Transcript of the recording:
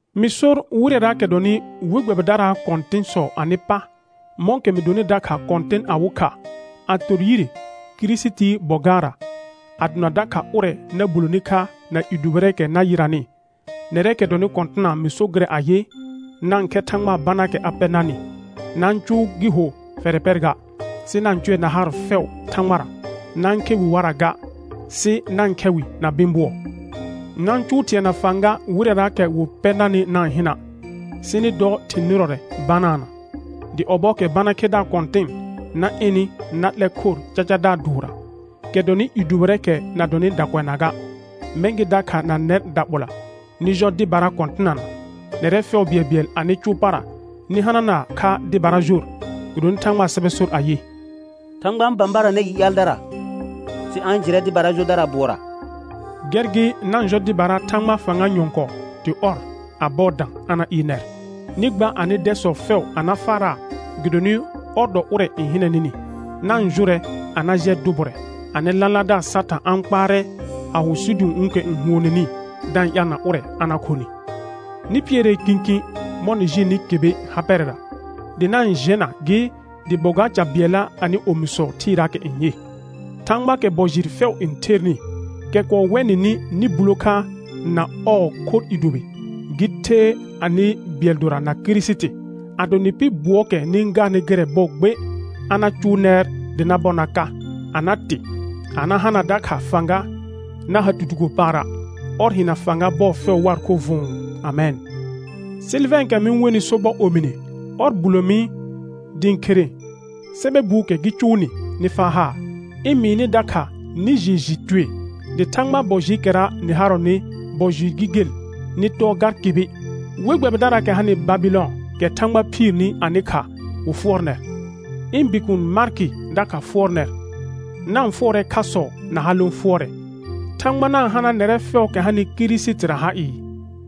Mɩ sor wɩrɛraakɛ dɔnɩ we gbɛbɩdaraa kɔ̃tɩ̃sɔ anɩ pa, mɔ̃kɛ mɩ donɩ dakha kɔ̃tɩn awɩ kha, a tor yire Kirisitii bɔ gaarra, a dona dakha ʋrɛ na buloni kha na i dʋbɩrɛɛkɛ na yɩranɩ, nɛrɛɛkɛ dɔnɩ kɔ̃tɩna mɩ so gɩrɛ ayɩ: Na-n khɛ Thãgbaa banaakɛ a pɛ narnɩ; na-n cʋʋ gɩ ho fɛrɛ pɛr ga, sɩ na-n cʋɛ na haar fɛʋ Thãgbara. Na-n khe wɩ warra ga, sɩ na-n khɛ wɩ na bɩ̃ bʋɔ. Na-n cʋʋ thɩ̃ɛ na fãga wɩrɛraakɛ wɩ pɛ narnɩ na-n hɩna', sɩ nɩ dɔ thɩ̃ nɩrɔrɛ banaana. Dɩ ɔbɔɔkɛ bana khedaar kɔ̃tɩn na ɩnɩ na 'lɛr khor cacadaar dʋʋrra, kɛ dɔnɩ i dʋbɩrɛɛkɛ na dɔnɩ dakʋɛnaa ga. Mɛ̃ gɩ dakha na nɛr daɓola, nɩ jɔ dɩbara kɔ̃tɩnana. Nɛrɛ fɛʋ bɩɛlbɩɛl anɩ cʋʋ para nɩ hanana kha dɩbara jor, gɩdonɩ Thãgbaa sɛbɛ sor ayɩ: «Thãgba n bãbaranɛ i ƴaaldara, sɩ a-n jɩrɛ dɩbara jodara bʋɔra.» Gɛr gɩ na-n jɔ dɩbara Thãgbaa fãga nyɔ̃kɔɔ dɩ ɔr, a bɔɔ dã, a na ɩɩr nɛr. Nɩ gba anɩ dɛsɔ fɛʋ a na faaraa gɩdonɩ ɔr dɔ ʋrɛ n hɩnɛ nɩnɩ. Na-n jʋrɛ a na jɩɛ dʋ bʋrɛ, anɩ lãlaardaar Satã a-n kpaarɛ a ho sidũ'ũukɛ n huoneni, da-n ƴaalna ʋrɛ a na khonɩ. Nɩ pɩɛrɛɛ kĩkĩ mɔ̃ nɩ jɩɩlnɩ kɩbɩ ha pɛrɛra, dɩ na-n jɛna gɩ dɩ bɔ gaar ca bɩɛlla anɩ omisɔ thɩɩraakɛ n yɩ. Thãgbaakɛ bɔ jɩɩr fɛʋ n thernɩ, kɛ kɔɔ wɛ nɩnɩ nɩ bulo kha na ɔɔ khorr i dʋbɩ, gɩ the anɩ bɩɛl dora na Kirisiti, ado nɩ pɩ bʋɔɔkɛ nɩ-n gaarnɩ gɩrɛ bɔɔ gbe, a na cʋʋ nɛr dɩ na bɔr na ka, a na tɩ, a na hana dakha fãga, na ha tutugo paara'. Ɔr hɩna fãga bɔɔ fɛʋ waa khorr vʋ̃ʋ. Amɛn. Sɩlvɛ̃ɛkɛ mɩ-n wenɩ sobɔ omine, ɔr bulo mi dɩ ɩ̃ khere sɛbɛ buukɛ gɩ cʋʋ nɩ nɩ faa haar, ɩ̃ mɩɩ nɩ dakha nɩ jɩɩ jɩ tue dɩ Thãgbaa bɔ jɩɩkɛra nɩ harɔnɩ bɔ jɩɩr gɩ gel, nɩ tɔɔ gar kɩbɩ. We gbɛbɩdaraakɛ hanɩ Babɩlɔn, kɛ Thãgba phiirni anɩ kha, wɩ fʋɔr nɛr. Ɩ̃ bikuun Markɩ dakha fʋɔr nɛr. Na-n fʋɔrɛ khasɔ na ha lõ fʋɔrɛ. Thãgba na-n hana nɛrɛ fɛʋʋkɛ hanɩ Kirisitira ha ɩɩ.